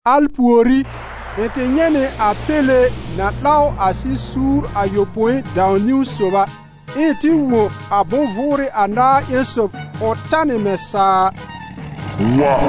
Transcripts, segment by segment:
Al pùorí, ɩ̃ tɩ nyɛ̃ nɩ a Péle na 'law a sɩ-suur ayopõi dãw-niwn sob a, ɛ ɩ̃ tɩ wõ a bʋ̃-vʋʋrɩ anaar ƴẽn sob ʋ tanɩ mɛ̃ saa a: «Wa!»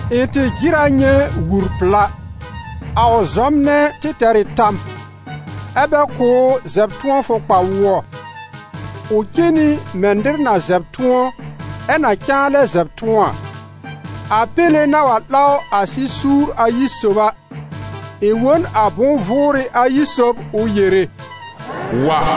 Ɩ̃ tɩ jɩr a nyɛ̃ wur-pla. A ʋ zɔmnɛ tɩ tɛr ɩ tam, ɛ́ bɛ kʋ̀ ʋ zɛb-tʋ̃ɔfʋ kpa-wʋɔ, ʋ cen nɩ mɛ̃ nɩr na zɛb tʋ̃ɔ, ɛ na cãa lɛ zɛb tʋ̃ɔ a. A Péle na wa 'law a sɩ-suur ayi sob a, ɩ̃ wõ n a bʋ̃-vʋʋrɩ ayi sob ʋ yere: «Wa!»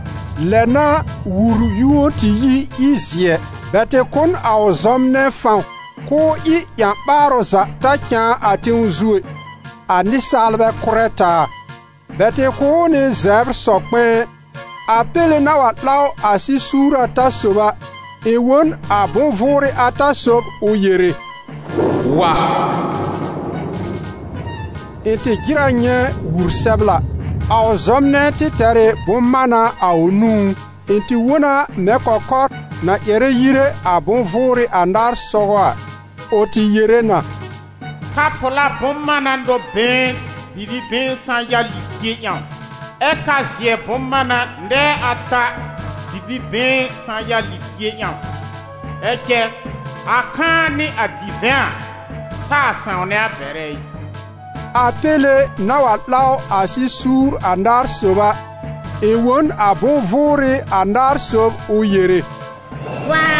Lɛ n'a wur yũo tɩ yi, ɩ zɩ̀ɛ. Bɛ tɩ kʋ̀ n a ʋ zɔmnɛ fãw k'ʋʋ ɩ ƴã-ɓaarʋ za ta cãa a tẽw zu ɛ, a nɩsaalbɛ kʋ́rɛ taa. Bɛ tɩ kʋ̀ ʋ nɩ zɛbr sɔ-kpɛ̃ɛ. A Péle na wa 'law a sɩ-suur ata sob a, ɩ̃ wõ n a bʋ̃-vʋʋrɩ ata sob ʋ yere: «Wa!» Ɩ̃ tɩ jɩr a nyɛ̃ wur-sɛbla. A ʋ zɔmnɛ tɩ tɛr ɩ bʋ̃-mána a ʋ nũú. Ɩ̃ tɩ wõ na mɛ̃ kɔkɔr na ƴɛrɛ yire a bʋ̃-vʋʋrɩ anaar sɔgɔ a, ʋ tɩ yere na: «Ka-pla bʋ̃-mána nɔ-been bibi-been sã-ya libie ƴãw, ɛ́ ka-zɩ̀ɛ bʋ̃-mána nɛɛ ata bibi-been sã-ya libie ƴãw. Ɛ cɛ, a kãa nɩ a divɛ̃ a, taa sãwnɛ a bɛrɛ ɩ.» A Péle na wa 'law a sɩ-suur anaar sob a, ɩ̃ wõ n a bʋ̃-vʋʋrɩ anaar sob ʋ yere: «Wa!»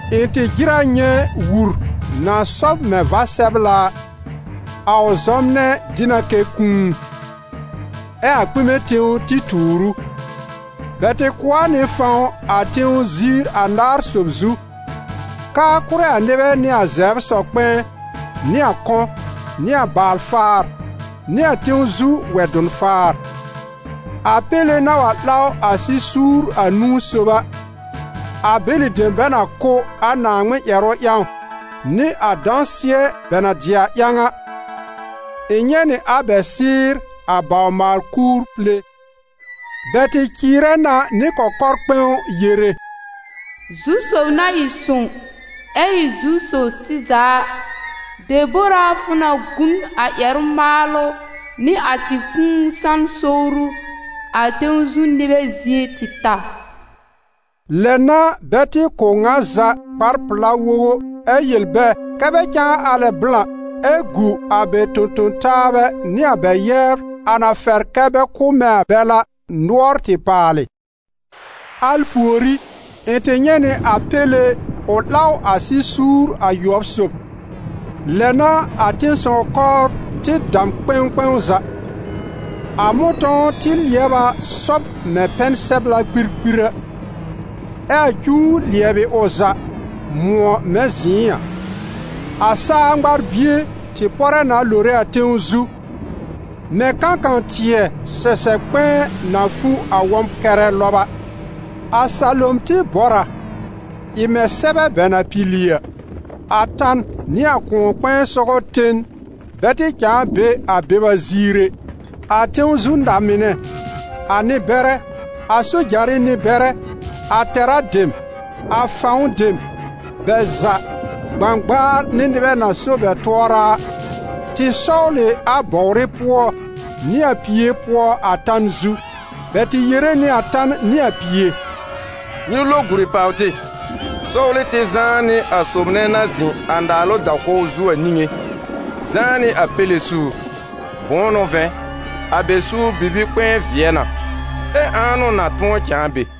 Ɩ̃ tɩ jɩr a nyɛ̃ wur na sɔb mɛ̃ va-sɛbla a. A ʋ zɔmnɛ dɩ na kɛ Kũu, ɛ a kpɩmɛ tẽw tɩ tuur ʋ. Bɛ tɩ kʋ̀ a nɩ fãw a tẽw ziir anaar sob zu, k'aa kʋ́rɛ a nɩbɛ nɩ a zɛbr sɔ-kpɛ̃ɛ, nɩ a kɔ̃, nɩ a baal-faar nɩ a tẽw zu wɛ-dʋn-faar. A Péle na wa 'law a sɩ-suur anũu sob a, a bɛlɩ dem bɛ na kʋ́ a Naaŋmɩn ƴɛrʋ ƴãw nɩ a dãsɩɛ bɛ na dɩ a ƴãw a, ɩ̃ nyɛ̃ nɩ a bɛ sɩ́ɩr a bawr-maal-kuur pile. Bɛ tɩ cɩɩrɛ na nɩ kɔkɔr-kpɛ̃w yere: «Zu-sob na ɩ sõw, ɛ ɩ Zu-sob sɩza a, debor a fʋ na gu n a ƴɛrʋ-maalʋ nɩ a tɩ kũu san sowru a tẽw zu nɩbɛ zie tɩ ta?» Lɛ n'a bɛ tɩ kʋ̀ ŋa za kpar-pla wogo, ɛ yel bɛ kɛ́ bɛ cãa alɛ blã, ɛ gu a bɛ tõ-tõ-taabɛ nɩ a bɛ yɛbr, a na fɛr kɛ bɛ kʋ́ mɛ̃ a bɛl a, nʋɔr tɩ paalɩ. Al pùorí, ɩ̃ tɩ nyɛ̃ nɩ a Péle ʋ 'law a sɩ-suur ayʋɔb sob. Lɛ n'a a tẽ-sɔw-kɔbr tɩ dam kpɛ̃w kpɛ̃w za! A mʋ̃tɔ̃w tɩ lɩɛb a sɔb mɛ̃ pɛn-sɛbla kpirkpir a, ɛ a cuw lɩɛbɩ ʋ za, mʋ̃ɔ mɛ̃ zɩ̃ɩ a; a saa ŋmar-bie tɩ pɔrɛ na lore a tẽw zu, mɛ̃ kãkã-tɩɛ sɛsɛb kpɛ̃ɛ na fu a wɔm-kɛrɛ lɔb a. A salom tɩ bɔr a, ɩ mɛ̃ sɛbɛ bɛ na pili a; a tan nɩ a kʋ̃ɔ-kpɛ̃ɛ sɔgɔ ten bɛ tɩ cãa be a beba ziir ɛ. A tẽw zu na-mɩnɛ, a nɩ-bɛrɛ, a sojarɩ nɩ-bɛrɛ, a tɛ̀rá dem, a fãw dem, bɛ za, gbãgbaar nɩ nɩbɛ na so bɛ tʋɔra a, tɩ sɔwl ɩ a bɔwrɩ pʋɔ nɩ a pie pʋɔ a tan zu. Bɛ tɩ yere nɩ a tan nɩ a pie: «Nyɩ lo guri pàw tɩ, sɔwlɩ tɩ zãá nɩ a sob nɛ na zɩ̃ a naalʋ da-kɔw zu a niŋé, zãá nɩ a Péle suur. Bʋ̃ʋ n'ʋ vɛ̃, a bɛ suur bibi-kpɛ̃ɛ vɩɛ na, ɛ ãa n'ʋ na tʋ̃ɔ cãa be?»